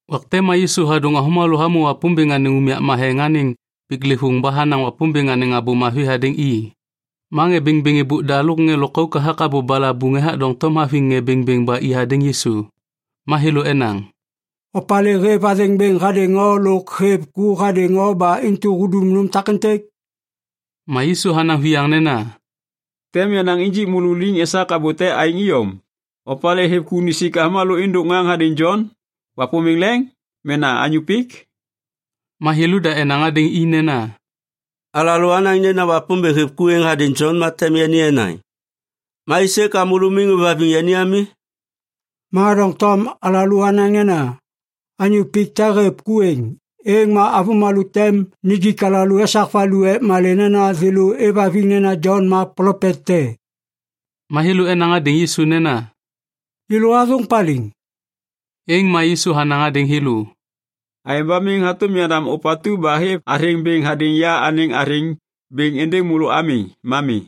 Wak te ma Yisu hadôŋ avômalô hamô Wapômbêŋ anêŋ unyak matheŋ anêŋ piklêvôŋ ba hanaŋ Wapômbêŋ anêŋ Abô Mavi hadêŋ i. Ma ŋê bêŋbêŋ êbôk da lôk ŋê lôkauk hathak abô balabuŋ ethak doŋtom haviŋ ŋê bêŋbêŋ ba i hadêŋ Yisu. Ma thêlô enaŋ, “Opalê hêv athêŋ bêŋ hadêŋ o lôk hêv ku hadêŋ o ba intu hudum nôm takêntêk?” Ma Yisu hanaŋ viyaŋ nena, “Tem yanaŋ injik môlô liŋ esak abô te aêŋ iyom. Opalê hêv ku nisik avômalô êndôk ŋaŋ hadêŋ Jon? Wapômbêŋ leŋ? Mena anyô pik?” Ma thêlôda enaŋ hadêŋ i nena, “Alalô anaŋ nena Wapômbêŋ hêv ku êŋ hadêŋ Jon ma tem yani enaŋ, ‘Ma aisê ka môlô miŋ ôêvhaviŋ yani ami?’ Ma doŋtom alalô anaŋ nena, ‘Anyô pik te hêv ku êŋ,’ êŋ ma avômalô tem nijik alalô esak valu ek malê nena thêlô êvhaviŋ nena Jon ma plopet te.” Ma thêlô enaŋ hadêŋ Yisu nena, “Yêlô athôŋ paliŋ.” Êŋ ma Yisu hanaŋ hadêŋ thêlô, “Aêŋ ba miŋ hatôm yandam ôpatu ba hêv athêŋ bêŋ hadêŋ ya anêŋ athêŋ bêŋ êndêŋ môlô ami. Ma mi.”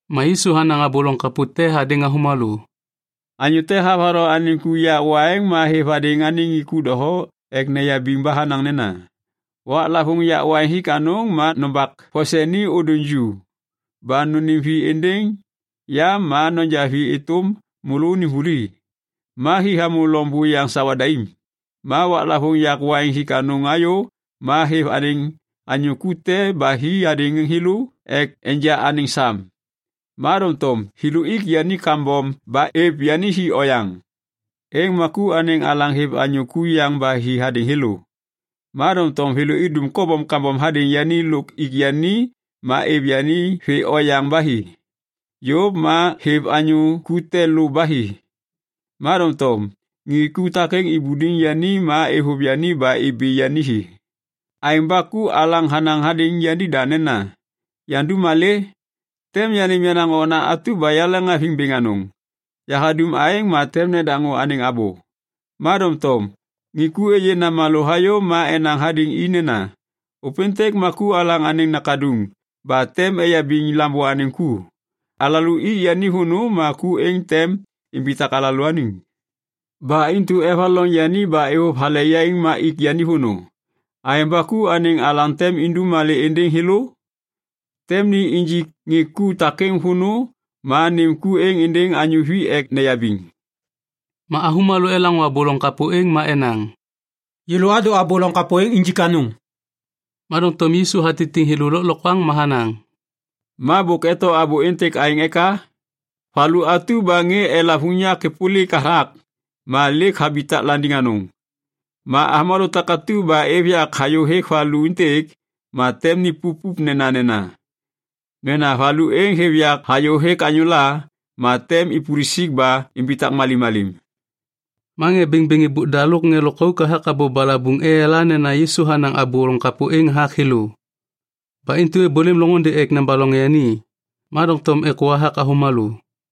Ma Yisu hanaŋ abô loŋ kapô te hadêŋ avômalô, “Anyô te havatho anêŋ ku yak waiŋ ma hêv hadêŋ ŋê ku doho ek neyabiŋ ba hanaŋ nena, ‘Waklavôŋ yak waiŋ hik anôŋ ma nombak vose ni ôdôŋ ju ba nônêm vi êndêŋ ya ma noja vi êtôm môlônim vuli.’ Ma hi hamô loŋ buyaŋ sawa daim. Ma waklavôŋ yak waiŋ hik anôŋ hayô ma hêv anêŋ anyô ku te ba hi hadêŋ thêlô ek enja anêŋ sam. Ma doŋtom thêlô ik yani kambom ba êv yani hi oyaŋ. Êŋ ma ku anêŋ alaŋ hêv anyô ku yaŋ ba hi hadêŋ thêlô, ma doŋtom thêlô idum kobom kambom hadêŋ yani lôk ik yani ma êv yani vê oyaŋ ba hi. Yôv ma hêv anyô ku te lô ba hi, ma doŋtom ŋê ku takêŋ ibuliŋ yani ma êvôv yani ba ibi yani hi. “Aêŋ ba ku alaŋ hanaŋ hadêŋ yanida nena, ‘Yandum malê? Tem yanêm yenaŋ okna atu ba yaleŋhaviŋ bêŋ anôŋ. Yahadum aêŋ ma tem nedaŋô anêŋ abô.’ Ma doŋtom ŋê ku êyê namalô hayô ma enaŋ hadêŋ i nena, ‘Ôpêntêk ma ku alaŋ anêŋ nakaduŋ ba tem eyabiŋ lambô anêŋ ku. Alalô ik yani vônô ma ku êŋ tem imbitak alalôaniŋ.’ Ba intu evaloŋ yani ba êvôv hale yaiŋ ma ik yani vônô. “Aêŋ ba ku anêŋ alaŋ tem indum malê êndêŋ thêlô? Tem ni injik ŋê ku takêŋ vônô ma nêm ku êŋ êndêŋ anyô vi ek neyabiŋ.” Ma avômalô elaŋô abô loŋ kapô êŋ ma enaŋ, “Yêlô adô abô loŋ kapô êŋ injik anôŋ!” Ma doŋtom Yisu hatitiŋ thêlô lôklokwaŋ ma hanaŋ, “Ma bôk eto abô êntêk aêŋ eka? “‘Valu atu ba ŋê elav unyak êpôlik hathak, ma lêk habitak landiŋ anôŋ.’ Ma avômalô takatu ba êv yak hayôhêk valu êntêk, ma tem nipup nenanena. Mena valu êŋ hêv yak hayôhêk anyôla, ma tem ipulusik ba imbitak malimmalim.” Ma ŋê bêŋbêŋ êbôk da lôk ŋê lôkauk hathak abô balabuŋ eyala nena Yisu hanaŋ abô loŋ kapô êŋ hathak thêlô. Ba intu êbôlêm loŋôndê ek nebaloŋ yani, ma doŋtom êkô hathak avômalô.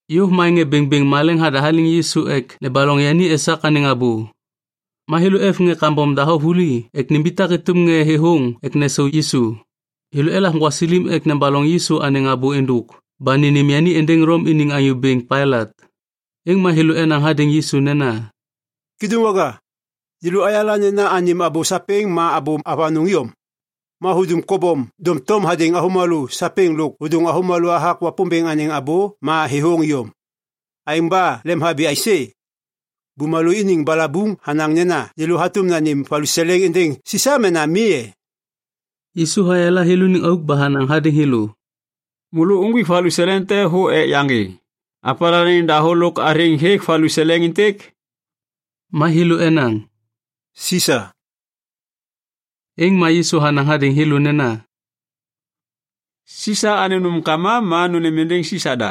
Yôv ma ŋê bêŋbêŋ maleŋ hadahaliŋ Yisu ek nebaloŋ yani esak anêŋ abô. Ma thêlô êv ŋê kambom doho vuli ek nimbitak êtôm ŋê thêthôŋ ek nesau Yisu. Thêlô elav gwasilim ek nebaloŋ Yisu anêŋ abô êndôk ba nênêm yani êndêŋ Lom iniŋ anyô bêŋ Pailat. Êŋ ma thêlô enaŋ hadêŋ Yisu nena, “Kêdôŋwaga, yêlô ayala nena anêm abô sapêŋ ma abô avanôŋ iyom. Ma hudum kobom doŋtom hadêŋ avômalô sapêŋ lôk hôdôŋ avômalô hathak Wapômbêŋ anêŋ abô ma thêthôŋ iyom. Aêŋ ba lemhabi aisê? Bumalô iniŋ balabuŋ hanaŋ nena yêlô hatôm nanêm valuseleŋ êndêŋ Sisa mena mi e?” Yisu hayala thêlôniŋ auk ba hanaŋ hadêŋ thêlô, “Môlô uŋgwik valuseleŋ te thô ek yaŋgê. Opalê anêŋ dahô lôk athêŋ hêk valuseleŋ êntêk?” Ma thêlô enaŋ, “Sisa.” Êŋ ma Yisu hanaŋ hadêŋ thêlô nena, “Sisa anêŋ nômkama ma nônêm êndêŋ Sisa da.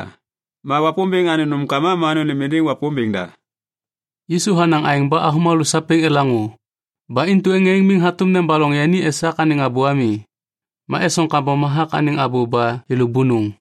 Ma Wapômbêŋ anêŋ nômkama ma nônêm êndêŋ Wapômbêŋ da.” Yisu hanaŋ aêŋ ba avômalô sapêŋ elaŋô. Ba intu ŋê êŋ miŋ hatôm nebaloŋ yani esak anêŋ abô ami. Ma esoŋ kambom hathak anêŋ abô ba thêlô bônôŋ.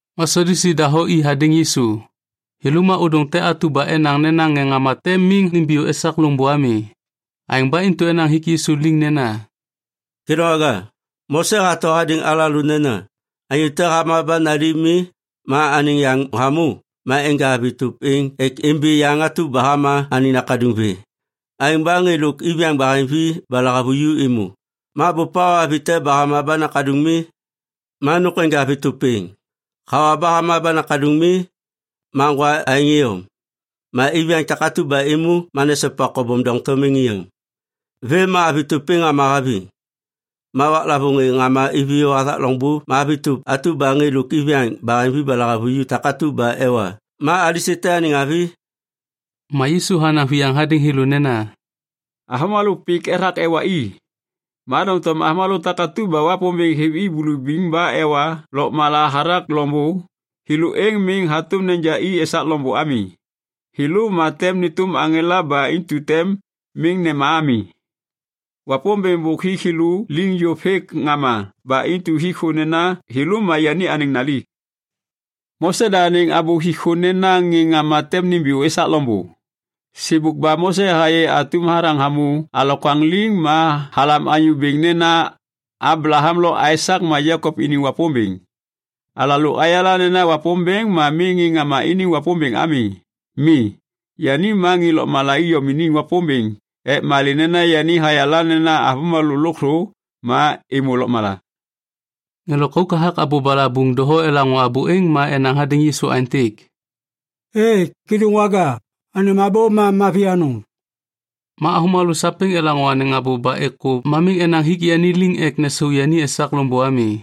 Ma Sadyusi doho i hadêŋ Yisu. Thêlô ma ôdôŋ te atu ba enaŋ nena ŋê ŋama tem miŋ nimbiyô esak loŋbô ami. Aêŋ ba intu enaŋ hik Yisu liŋ nena, “Kêdôŋwaga, Mose hato hadêŋ alalô nena, ‘Anyô te hama ba nali mi ma anêŋ yaŋ hamô, ma enja avi tôp êŋ ek imbi yaŋ atu ba hama anêŋ nakaduŋ vê.’ Aêŋ ba ŋê lôk iviyaŋ baheŋvi ba lahavuju êmô. Ma bôp hawa avi te ba hama ma nakaduŋ mi. Ma nôk enja avi tôp êŋ, hawa ba hama ba nakaduŋ mi. Ma ŋgwa aêŋ iyom. Ma iviyaŋ takatu ba êmô ma nesopa kobom doŋtom êŋ iyom. Vêm ma avi tôp êŋ hama haviŋ. Ma waklavôŋ ŋê ŋama iviyô hathak loŋbô ma avi tôp atu ba ŋê lôk iviyaŋ baheŋvi ba lahavuju takatu ba ewa ma alisê te anêŋ avi?” Ma Yisu hanaŋ viyaŋ hadêŋ thêlô nena, “Avômalô pik ethak ewa i, ma doŋtom avômalô takatu ba Wapômbêŋ hêv i bulubiŋ ba ewa lôkmala hathak loŋbô, thêlô êŋ miŋ hatôm neja i esak loŋbô ami. Thêlô ma tem nêtôm aŋela ba intu tem miŋ nema ami. Wapômbêŋ bôk hik thêlô liŋ yôv hêk ŋama ba intu hik thô nena thêlô ma yani anêŋ nali. “Mose da anêŋ abô hik thô nena ŋê ŋama tem nimbiyô esak loŋbô. Sêbôk ba Mose hayê atum hathaŋ hamô alokwaŋ liŋ ma halam Anyô Bêŋ nena ‘Ablaham lo Aisak ma Jekop iniŋ Wapômbêŋ.’ Alalô ayala nena Wapômbêŋ ma miŋ ŋê ŋama iniŋ Wapômbêŋ ami. Mi, yani ma ŋê lôkmala iyom iniŋ Wapômbêŋ ek malê nena yani hayala nena avômalô lôkthô ma êmô lôkmala.” Ŋê lôkauk hathak abô balabuŋ doho elaŋô abô êŋ ma enaŋ hadêŋ Yisu aêntêk, “Êê, Kêdôŋwaga, anêm abô ma mavi anôŋ!” Ma avômalô sapêŋ elaŋô anêŋ abô ba êkô ma miŋ enaŋ hik yani liŋ ek nesau yani esak loŋbô ami.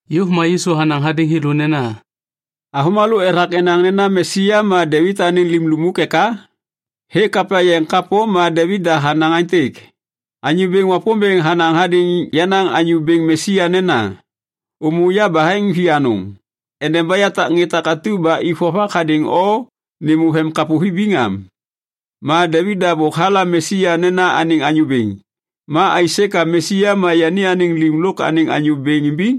Yôv ma Yisu hanaŋ hadêŋ thêlô nena, “Avômalô ethak enaŋ nena Mesia ma Devit anêŋ lim lukmuk eka? Hêk Kapya Yeŋ kapô ma Devit da hanaŋ aêntêk, “‘Anyô Bêŋ Wapômbêŋ hanaŋ hadêŋ yenaŋ Anyô Bêŋ Mesia nena, “Ômô yabaheŋ vianôŋ endeba yatak ŋê takatu ba ik vovak hadêŋ o nêmô vemkapô vibiŋ am.” ’ Ma Devit da bôk halam Mesia nena anêŋ Anyô Bêŋ. Ma aisê ka Mesia ma yani anêŋ lim lôk anêŋ Anyô Bêŋ imbiŋ?”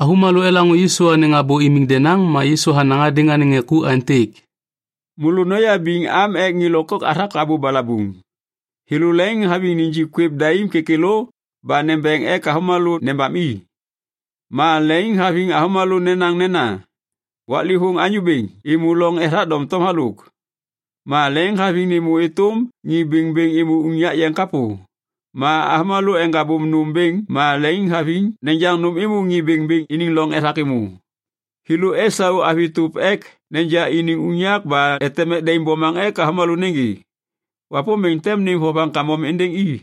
Avômalô elaŋô Yisu anêŋ abô imiŋ denaŋ ma Yisu hanaŋ hadêŋ anêŋ ŋê ku aêntêk, “Môlô noyabiŋ am ek ŋê lôkauk hathak abô balabuŋ. Thêlô leŋiŋhaviŋ nijik kwêv daim kêkêlô ba nembeŋ ek avômalô nebam i. Ma leŋiŋhaviŋ avômalô nenaŋ nena, ‘Waklêvôŋ anyô bêŋ’ êmô loŋ ethak doŋtom halôk. Ma leŋiŋhaviŋ nêmô êtôm ŋê bêŋbêŋ êmô unyak yeŋ kapô. Ma avômalô eŋgabôm nôm bêŋ ma leŋiŋhaviŋ nejaŋ nôm êmô ŋê bêŋbêŋ iniŋ loŋ ethak êmô. Thêlô esau avi tôp ek neja iniŋ unyak ba eteŋ mek daim bomaŋ ek avômalô nêgê. Wapômbêŋ tem nêm vovaŋ kambom êndêŋ i.”